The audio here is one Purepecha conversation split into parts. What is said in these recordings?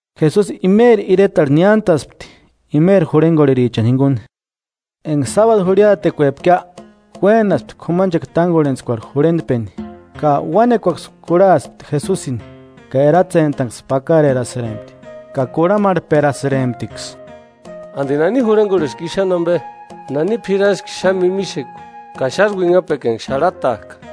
Jesusi imeri iretarhu niántaspti, imeri jurhengorherichani jinguni. Enga sábadu jurhiatekuepkia uénaspti k'umanchekua tángorhentskuarhu Sinagogarhu. jurhentpeni. Ka uánekuaksï kurhaspti Jesusini, ka eratsentanksï pakarerasïrempti, ka kurhamarhperasïremptiksï: –¿Andi nani jurhengorheski i xáni ambe? ¿Nani p'iraski xáni mímixekua ka xásï uinhapekua enga xarhatajka?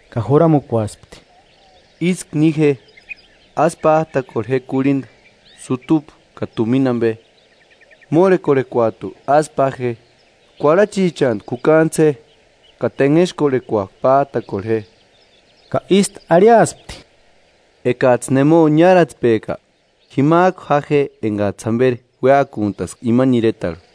Ka juramukuaspti: –Ísku ni je, ásï pájtakorhe je kurhinda, sutupu ka tumina ambe. Mórhekorhekuajtu ásï pa je, kuarhachichantku jukaantsï je, ka tenhexkorhekuajku pájtakorhe je. Ka ístu arhiaspti: –Ekajtsï nemo niáratspejka, jimajku ja je engajtsï jamberi uéakuntaska imani iretarhu.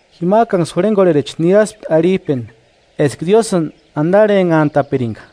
Jimajkanksï jurhengorhericha niraspti arhijpeni eska Diósïni andarhenhantapiringa.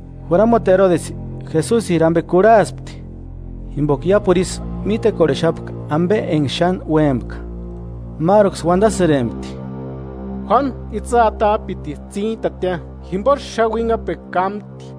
Juramuti Erodesi Jesusiri ambe kurhaspti, jimboka iápuru isï mítekorhexapka ambe enga xáni uémpka. Máruksï uandasïrempti: “Juánu itsï atajtsïkpitisï tsíntatia, jimbosï xáni uinhapekua kámti.”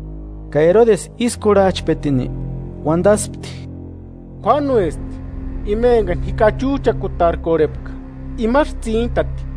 Ka Erodesi ísï kurhajchpetini, uandaspti: –Juánuesti, ima engani ji kachujchakutarkorhepka, imasï tsíntati.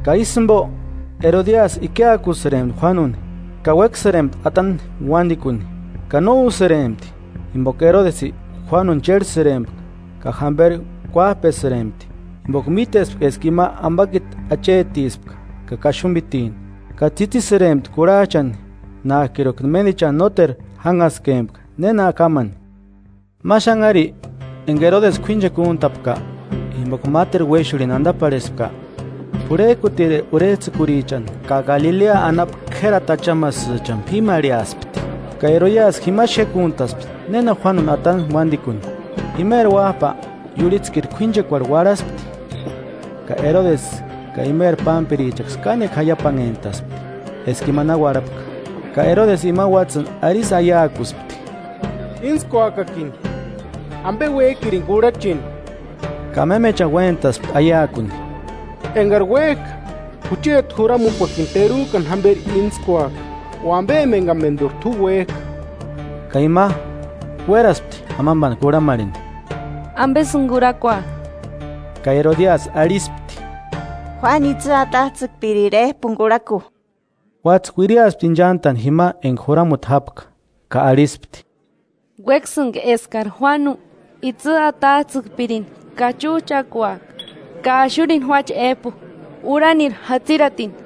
Ka ísï jimbo, Erodiasi ikiakusïrempti Juánuni, ka uéksïrempti atani uándikuni, ka no úsïrempti. Jimboka Erodesi Juánuni chérhesïrempka ka jámberi kuájpesïrempti, jimboka mítespka eska ima ambakiti achetispka ka kaxumbitini, ka tsitisïrempti kurhajchani, nájkiruka ménichani nóteru jánhaskempka néna kámani. Ma xanhari enga Erodesi k'uínchekua úntapka, jimboka máteru uéxurhini andaparhespka, p'urhejkutiri Kuári uarhipiti (sondaduecha) urhejtsïkurichani, ka Galilea anapu k'érati achamasïchani p'ímarheaspti. Ka Erodiasi jima xékuntaspti néna Juánuni atani uándikuni. Imeri uájpa iurhitsïkiri k'uínchekuarhu uarhaspti. Ka Erodesi ka imeri pámpirichaksï kánekua jaiapanhentaspti eska ima na uarhapka, ka Erodesi imani uátsïni arisï aiakuspti: –Íntskuakakini ambe uéjkirini kurhacheni. Ka mémechani uéntaspti aiakuni: “Engari uéjka, jucheti juramukuakini terujkani jamberi íntskuaka, o ambe emangamenduri t'u uéjka.” Ka ima, uéraspti amambani kurhamarheni: –¿Ambesïni kurhakua? Ka Erodiasi arhispti: –Juánu itsï atajtsïkpiriri éjpuni kurhaku. Uátsï uiriaspti inchantani jima enga juramuti jápka, ka arhispti: –Uéksïnga eskari Juánu itsï atajtsïkpirini kachujchakuaka, ka axurini juáche éjpu, urhanirhu jatsiratini.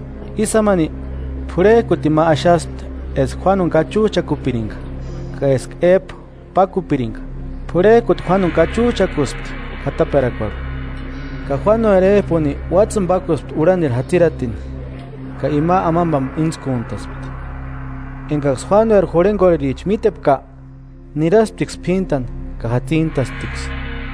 Ísï jámani p'urhejkutini ma axaspti eska Juánuni kachujchakupiringa, ka eska éjpu pákupiringa. P'urhejkuti Juánuni kachujchakuspti k'ataperakuarhu ka Juánueri éjpuni uátsïni pákuspti urhanirhu jatsiratini. Ka ima amambani íntskuntaspti. Engaksï Juánueri jurhengorhericha mítepka, nirasptiksï p'íntani ka jatsintasptiksï.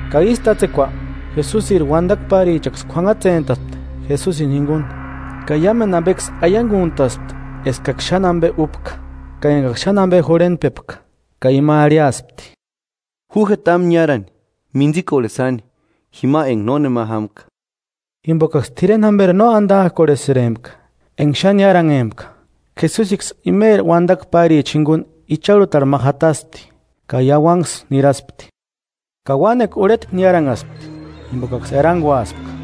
Ka ísï tátsekua, Jesusiri uandakua párichaksï k'uanhatsentaspti Jesusini jinguni, ka iámendu ambeksï aianguntaspti eskaksï xáni ambe úpka ka engaksï xáni ambe jurhentpepka. Ka ima arhiaspti: –Ju je támu niárani, mintsikorheni sáni, jima enga nónema jámka. Jimbokaksï t'ireni jamberi no andajkorhesïrempka, enga xáni niáranhempka. Jesusiksï imeri uandakua páricha jinguni icharhutarhu ma jataspti ka iauanksï niraspti. Ka uánekua urhetku niáranhaspti, jimbokaksï eranguaspka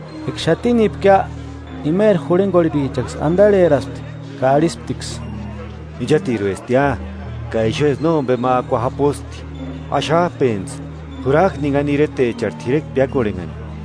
Eka xatinipkia, imeri jurhengorherichaksï andarheraspti ka arhisptiksï: –Inchatiruestia, ka ixuesï nómbema akua japusti. Axajpentsï, jurajku ninhani iretecharhu t'irekua piákorhenhani.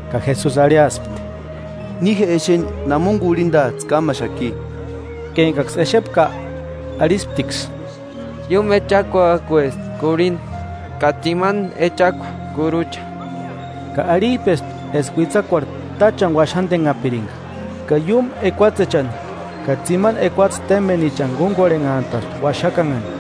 Ka Jesusi arhiaspti: –Ni je exeni namoni kurhindajtsï kámaxaki. Ka engaksï exepka, arhisptiksï: –Iúmu echakuajkuesti kurhinda ka tsimani echakua kurucha. Ka arhijpespti eska uitsakuarhu táchani uaxandenhapiringa. Ka iúmu ekuatsechani ka tsimani ekuatse témbenichani kúngorhenhantaspti uaxakanhani.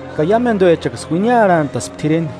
Ka iámenduechaksï uiniarhantaspti t'ireni;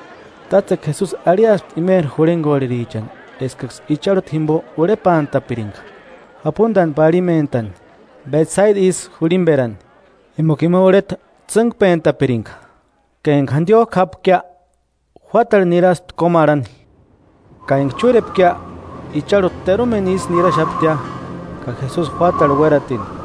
Tátsekua Jesusi arhiaspti imeri jurhengorherichani eskaksï icharhuta jimbo urhepantapiringa, japundani parhimentani, Betsaida isï jurhimberani, jimboka ima urheta tsîngpentapiringa. Ka enga jandiojku jápkia, juátarhu niraspti kómarhani. Ka enga chúrepkia, icharhuta terumeni isï niraxaptia. Ka Jesusi juátarhu uératini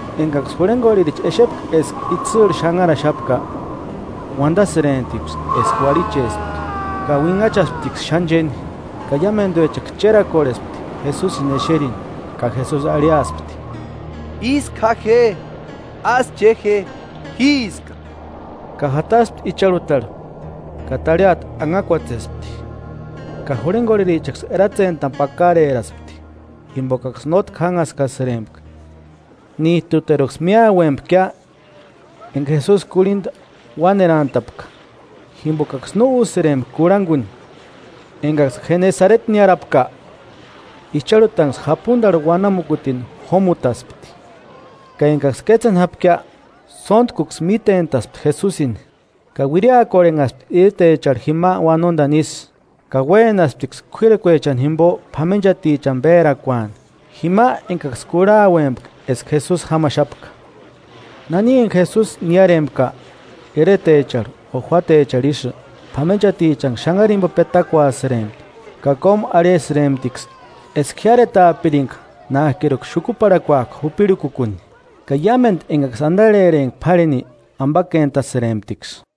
Engaksï jurhengorhericha exepka eska itsïrhu xanharaxapka, uandasïremptiksï eska uarhichespka, ka uinhachasptiksï xáni chéni, ka iámenduechaksï chérakorhespti Jesusini exerini. Ka Jesusi arhiaspti: –¡Ísku ja je! ¡Ásï ché je! ¡Jíska! Ka jataspti icharhutarhu, ka tarhiata anhakuatsespti. Ka jurhengorherichaksï eratsentani pakareraspti, jimbokaksï nótki jánhaskasïrempka, níjtuteruksï míauempkia enga Jesusi kurhinda uánerantapka, jimbokaksï no úsïrempka kurhanguni. Engaksï Jenesareti niárapka, icharhutanksï japundarhu uanamukutini jómutaspti. Ka engaksï kétseni jápkia, sóntkuksï mítentaspti Jesusini. Ka uiriakorhenhaspti iretecharhu jima uanondani isï, ka uénasptiksï k'uírakuechani jimbo p'amenchatichani pérakuani, jima engaksï kurhauempka eska Jesusi jámaxapka. Nani enga Jesusi niárempka, iretecharhu o juátecharhu isï, p'amenchatichanksï xanhari jimbo petakuasïrempti, ka kómu arhisïremptiksï, eska jiáretaapiringa nájkiruka xukuparhakuajku jupirhukukuni; Ka iámendu engaksï andarhempka p'árheni, ambakentasïremptiksï.